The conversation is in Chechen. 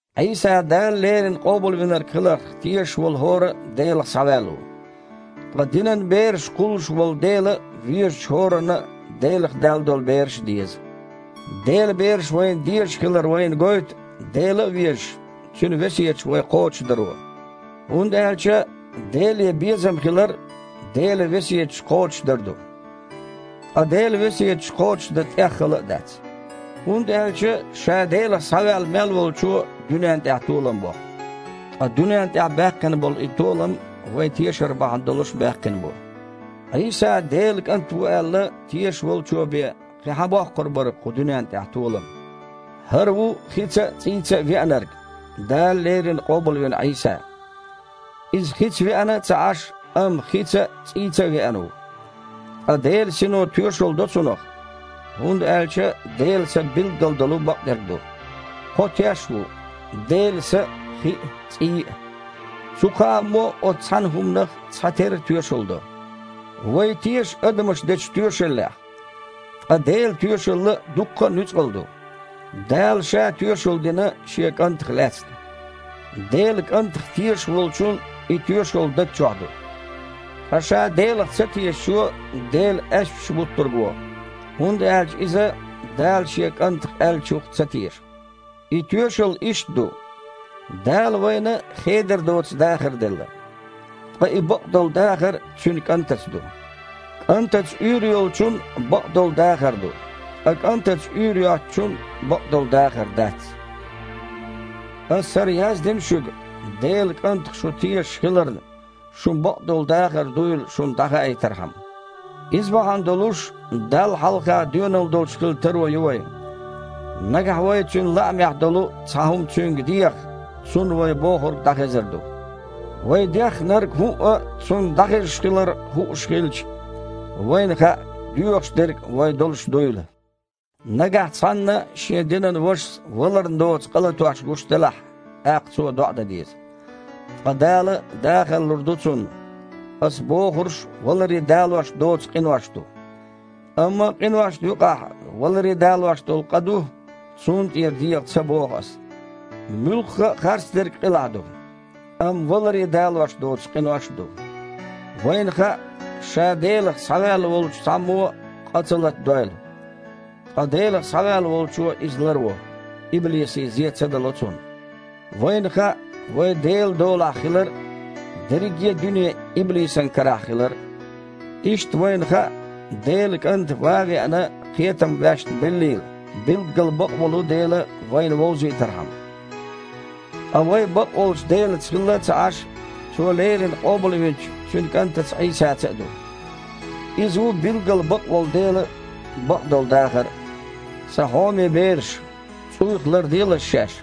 Іийса Дала леррина Къобалвинарг хиларх тешаш волу хІора а Делах схьаваьлла ву. Ткъа динан бераш кхуллуш волу Дела везачу хІоранна а Делах даьлла долу бераш а деза. Делан бераш вайна дезаш хилар вайна гойту, Дела а везаш, Цуьнан весеташ вай кхочушдаро. ХІунда аьлча Деле безам хилар – Делан весеташ кхочушдар ду. Ткъа Делан весеташ кхочушдан тІех хала а дац, хІунда аьлча ша Делах схьаваьлла мел волчо дуьненна тІехь толам боккху. Ткъа дуьненна тІехь баьккхина болу и толам вайн тешар бахьана долуш баьккхина бу. Іийса Делан КІант ву аьлла, тешаш волчо бен кхин хьан боккхур бара кху дуьненна тІехь толам? ХІара ву хица а, цІийца а Веанарг: Дала леррина къобалвина Іийса. Иза хица веана а ца Іаш, амма хица а, цІийца а веана ву. Ткъа Делан Сино тоьшалла до цунах, хІунда аьлча Делан Са билггал долу бакъдерг ду. Кхо теш ву: Делан Са а, хи а, цІий а. Цу кхааммо а оцу цхьана хІуманах цхьатерра тоьшалла до. Вай теша адамаша дечу тоьшаллех, ткъа Делан тоьшалла дуккха а нуьцкъала ду. Дала Ша тоьшалла дина Шен КІантах лаьцна. Делан КІантах тешаш волчун и тоьшалла даг чохь ду. Ткъа ша Делах цатешачо Дела аьшпаш буттург во, хІунда аьлча иза Дала Шен КІантах аьллачух ца теша. И тоьшалла иштта ду: Дала вайна хедар доцу дахар делла. Ткъа и бакъдолу дахар Цуьнан КІантаца ду. КІантаца уьйр йолчун бакъдолу дахар ду. Ткъа КІантаца уьйр йоцучун бакъдолу дахар дац. Аса хІара яздина шуьга, Делан КІантах шу тешаш хиларна, шун бакъдолу дахар дуйла шуна дІахаийтархьама. Иза бахьана долуш Далла хьалха доьналла долуш хила таро ю вайн. Нагахь вай Цуьнан лаамехь долу цхьа хІума Цуьнга дехахь, Цунна вай бохург дІахезар ду. Вай деххнарг хІуъа а Цунна дІахезаш хилар хууш хилча, вайна хаьа, доьхуш дерг вайн долуш дуйла. Нагахь цхьанна шен динан вашас валарна доцу къа латош гуш делахь, тІаккха цо доІа дан деза. Ткъа Дала дахар лур ду цунна. Аса бохурш валаре далош доцу къинош ду. Амма къиношна юкъахь валаре далош долу къа а ду, цунна тІера деха ца боху аса. Муьлхха а харцдерг къилахь ду. Амма валаре далош доцу къинош а ду. Вайна хаьа, ша Делах схьаваьлла волчу цхьаммо а къа ца латадойла. Ткъа Делах схьаваьлла Волчо иза ларво – иблисе зе ца дало цунна. Вайна хаьа вай Делан долахь хилар а, дерриге а дуьне иблисан карахь хилар а. Иштта вайна хаьа, Делан КІанта, ван а веана, кхетам ваьшна беллийла, билггал бакъволу Дела вайна вовзийтархьама. Ткъа вай, бакъволчу Делаца хилла а ца Іаш, Цо леррина къобалвинчу Цуьнан КІантаца Іийсаца а ду. Иза ву билггал бакъволу Дела а, бакъдолу дахар а! Сан хьоме бераш! ЦІуйх ларделаш шаьш.